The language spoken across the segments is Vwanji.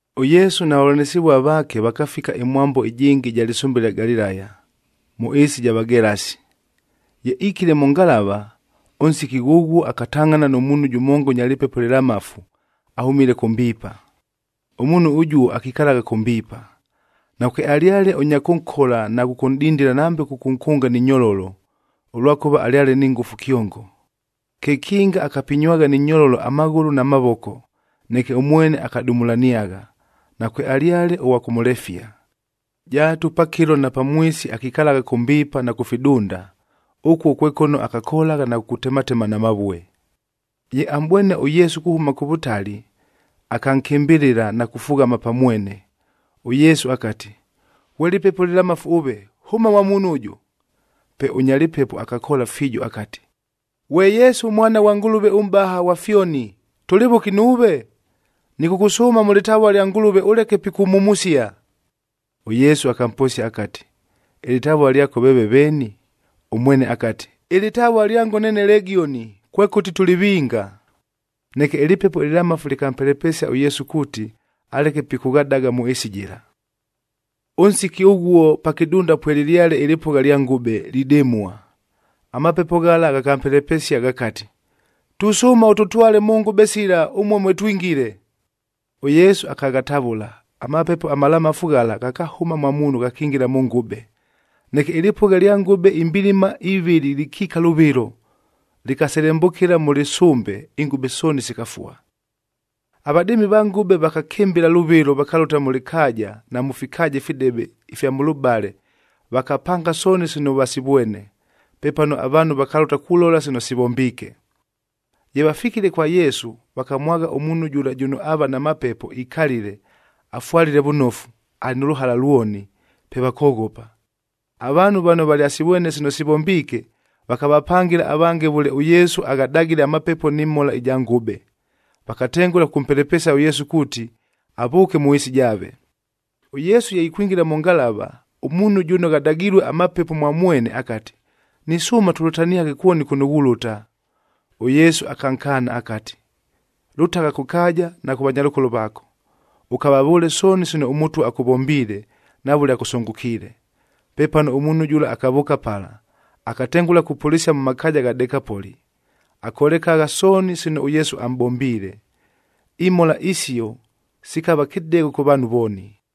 ɄYesu na vavʉlanɨsɨvua vaake vakafika ɨmwambo ɨjɨngɨ ɨja lɨsʉmbe ɨlya Galilaya, mʉ ɨɨsi ɨja Vagelasi. Ye ikile mʉ ngalava, ʉnsiki ghʉghuo akatangʼhana nʉ muunhu jʉmonga ʉnya lɨpepo ɨlɨlamafu ahʉmile kʉ mbiipa. Ʉmuunhu ʉjuo akikalagha kʉ mbiipa. Nakwealyale ʉnya kʉnkola na kʉkʉnʼdindila nambe kʉkʉnkʉnga ni nyololo, ʉlwakʉva alyale ni ngʉfu kyongo. Kekinga akapinywagha ni nyololo amaghʉlʉ na mavoko, neke ʉmwene akadumulaniagha, nakwealyale ʉghwa kʉmʉlefia. Jaatu pakɨlo na pamwisi akikalagha kʉ mbiipa na kʉ fidunda, ʉkuo kwe kʉno akakolagha na kukutematema na mavue. Ye amʼbwene ʉYesu kuhʉma kʉ vʉtali, akankɨmbɨlɨla na kufughama pa mwene. ɄYesu akati, “Ghwe lɨpepo lɨlamafu ʉve! Hʉma mwa muunhu ʉjʉ!” Pe ʉnya lɨpepo akakoola fiijo akati, “Ghwe Yesu, Mwana ghwa Ngʉlʉve ʉMʼbaha ghwa fyoni, tʉlɨ vʉki nuuve? Nɨkʉkʉsʉʉma mʉ lɨtavua lya Ngʉlʉve ʉleke pikʉmhumusia.” ɄYesu akamposia akati, “Ɨlɨtavua lyako veeve veeni?” Ʉmwene akati, “Ɨlɨtavua lyango neene Legioni,a kwekʉti tʉlɨ vinga.” Neke ɨlɨpepo ɨlɨlamafu lɨkampelepesia ʉYesu kuuti, aleke pikʉghadaga mʉ ɨɨsi jɨla. Ʉnsiki ʉghuo pa kɨdunda pwelɨlyale ɨlɨpʉgha lya ngʉbe, lidɨmua. Amapepo ghala ghakampelepesia ghakati, “Tusʉʉma ʉtʉtwale mʉ ngʉbe sila, ʉmuo mwe twingile.” ɄYesu akaghatavʉla, amapepo amalamafu ghala ghakahʉma mwa muunhu ghakingila mʉ ngʉbe. Neke ɨlɨpʉgha ɨlya ngʉbe imbilima ivɨlɨ lɨkiika lʉvɨlo, lɨkaselembʉkɨla mʉ lɨsʉmbe, ingʉbe sooni sikafua. Avadɨɨmi va ngʉbe vakakɨmbɨla lʉvɨlo vakalʉta mʉ lɨkaaja na mʉ fikaaja ifidebe ifya mʉlʉbale, vakapanga sooni sino vasivwene. Pepano avaanhu vakalʉta kulola sino sivombiike. Ye vafikile kwa Yesu, vakamwagha ʉmuunhu jʉla jʉno aava na mapepo ikalile, afwalile vʉnofu, alɨ nʉ lʉhala lwoni, pe vakoghopa. Avaanhu vano valyasivwene sino sivombiike, vakavapangɨla avange vʉle ʉYesu aghadagile amapepo nɨ mhola ja ngʉbe. Vakatengʉla kʉkʉmpelepesia ʉYesu kuuti, avʉʉke mʉ ɨɨsi jaave. ɄYesu ye ikwingila mʉ ngalava, ʉmuunhu jʉno ghadagilue amapepo mwa mwene akati, “Nisʉʉma tʉlʉtaniaghe kwoni kʉno ghulʉta.” ɄYesu akankaana akati, “Lʉtagha kʉ kaaja na kʉ vanyalʉkolo vaako, ʉkavavʉʉle sooni sino ʉMʉtwa akʉvombiile na vʉle akʉsʉngʉkiile.” Pepano ʉmuunhu jʉla akavʉʉka pala, akatengʉla kupʉlɨsia mʉ makaaja gha Dekapoli.b Akolekagha sooni sino ʉYesu amʼbombiile. Imhola isio sikava kɨdegho kʉ vaanhu vooni.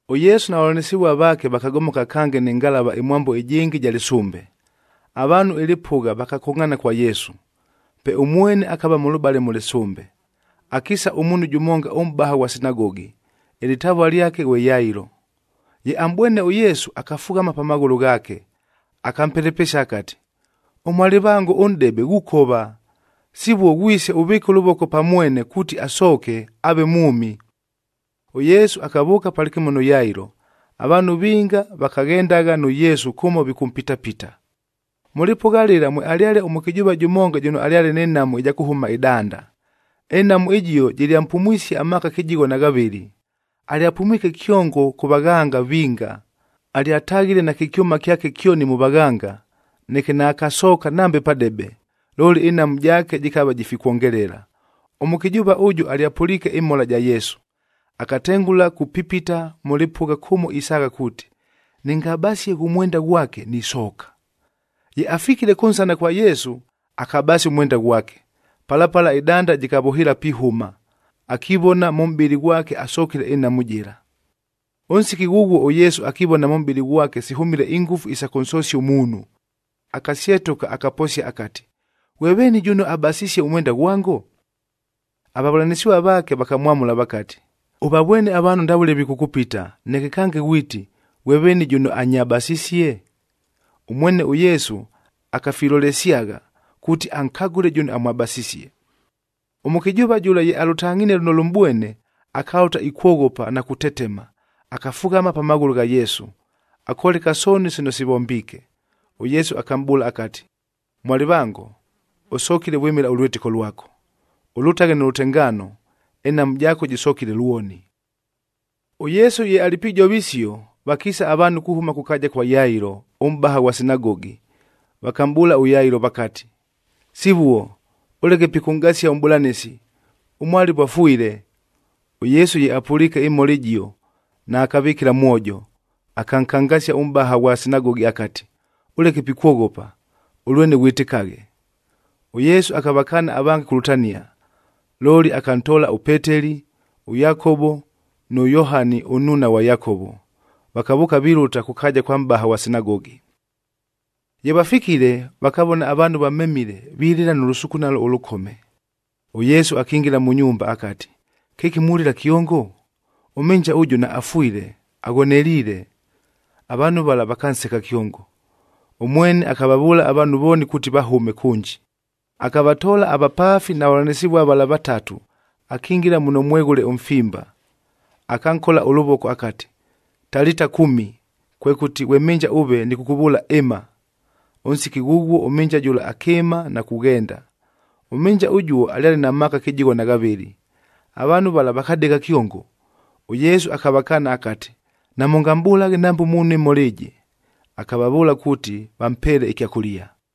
ɄYesu na vavʉlanɨsɨvua vaake vakagomoka kange nɨ ngalava ɨmwambo ɨjɨngɨ ɨja lɨsʉmbe. Avaanhu ɨlɨpʉgha vakakongʼhaana kwa Yesu, pe ʉmwene akava mʉlʉbale mʉ lɨsʉmbe. Akiisa ʉmuunhu jʉmonga ʉmʼbaha ghwa sinagogi, ɨlɨtavua lyake ghwe Yailo. Ye amʼbwene ʉYesu, akafughama pa maghʉlʉ ghaake, akampelepesia akati, “Ʉmwalɨvango ʉnʼdebe ghukova. Sivuo ghwise ʉvɨɨke ʉlʉvoko pa mwene kuuti asooke, aave mwʉmi.” ɄYesu akavʉʉka palɨkɨmo nʉ Yailo. Avaanhu vinga vakaghendagha nʉ Yesu kʉmo vikʉmpitapita. Mʉ lɨpʉgha lɨla mwealyale ʉmʉkɨjʉʉva jʉmonga jʉno alyale nɨ nhamu ɨja kʉhʉma ɨdanda. Ɨnhamu ɨjio jɨlyampumwisie amaaka kɨjigho na ghavɨlɨ. Alyapumwike kyongo kʉ vaghanga vinga. Alyataghile nakɨ kyʉma kyake kyoni mʉ vaghanga, neke naakasooka nambe padebe, looli, ɨnhamu jaake jɨkava jifikwongelela. Ʉmʉkɨjʉʉva ʉjʉ alyapʉliike ɨmhola ja Yesu, akatengʉla kupipita mʉ lɨpʉgha kʉmo isaagha kuuti, “Nɨngabasie ghʉ mwenda ghwake, nisooka.” Ye afikile kʉnsana kwa Yesu, akabasia ʉmwenda ghwake. Pala pala, ɨdanda jɨkavʉhɨɨla pihʉma, akivona mʉ mʼbɨlɨ ghwake asokile ɨnhamu jɨla. Ʉnsiki ghʉghuo ʉYesu akivona mʉ mʼbɨlɨ ghwake sihʉmile ingʉfu isa kʉnsosia ʉmuunhu, akasyetʉka, akaposia akati, “Ghwe veeni jʉno abasisie ʉmwenda ghwango?” Avavʉlanɨsɨvua vaake vakamwamʉla vakati, “Ʉvavwene avaanhu ndavʉle vikʉkʉpita, neke kange ghwiti, ‘Ghwe veeni jʉno anyabasisie?’” Ʉmwene ʉYesu akafilolesyagha, kuuti ankagʉle jʉno amwabasisie. Ʉmʉkɨjʉʉva jʉla ye alʉtangʼhinie lʉno lʉmʼbwene, akalʉta ikwoghopa na kutetema,c akafughama pa maghʉlʉ gha Yesu, akoleka sooni sino sivombiike. ɄYesu akamʼbʉʉla akati, “Mwalɨvango, ʉsokile vwɨmɨla ʉlwɨtɨko lwako, ʉlʉtaghe nʉ lʉtengaano, ɨnhamu jaako jɨsokile lwoni.” ɄYesu ye alɨ pijova isio, vakiisa avaanhu kuhʉma kʉ kaaja kwa Yailo ʉmʼbaha ghwa sinagogi, vakamʼbʉʉla ʉYailo vakati, “Sivuo, ʉleke pikʉnʼgasia ʉMʼbʉlanɨsi, ʉmwalɨvo afwile.” ɄYesu ye apʉliike ɨmhola ɨjio, naakavɨkɨla mwojo, akankangasia ʉmʼbaha ghwa sinagogi akati, “Ʉleke pikwoghopa, ʉlwene ghwɨtɨkaghe.” ɄYesu akavakaana avange kulʉtania, looli akantoola ʉPeteli, ʉYakovo nʉ Yohani ʉnnuuna ghwa Yakovo, vakavʉʉka vilʉta kʉ kaaja kwa mʼbaha ghwa sinagogi. Ye vafikile, vakavona avaanhu vamemile vilɨla nʉ lʉsukunalo ʉlʉkome. ɄYesu akingila mʉ nyumba akati, “Kɨki mulɨla kyongo? Ʉmhɨnja ʉjʉ naafwile, aghoneliile.” Avaanhu vala vakanseka kyongo. Ʉmwene akavavʉʉla avaanhu vooni kuuti vahʉme kʉnji. Akavatoola avapaafi na vavʉlanɨsɨvua vala vatatu akingila muno mweghʉle ʉmfimba. Akankola ʉlʉvoko akati, “Talita kumi,” kwekʉti, “Ghwe mhɨnja ʉve nɨkʉkʉvʉʉla ɨma!” Ʉnsiki ghʉghuo ʉmhɨnja jʉla akɨɨma na kughenda. Ʉmhɨnja ʉjuo alyale na maaka kɨjigho na ghavɨlɨ. Avaanhu vala vakadegha kyongo! ɄYesu akavakaana akati, “Namʉngamʼbʉlaghe nambe muunhu ɨmhola ɨjɨ.” Akavavʉʉla kuuti vampeele ɨkyakʉlia.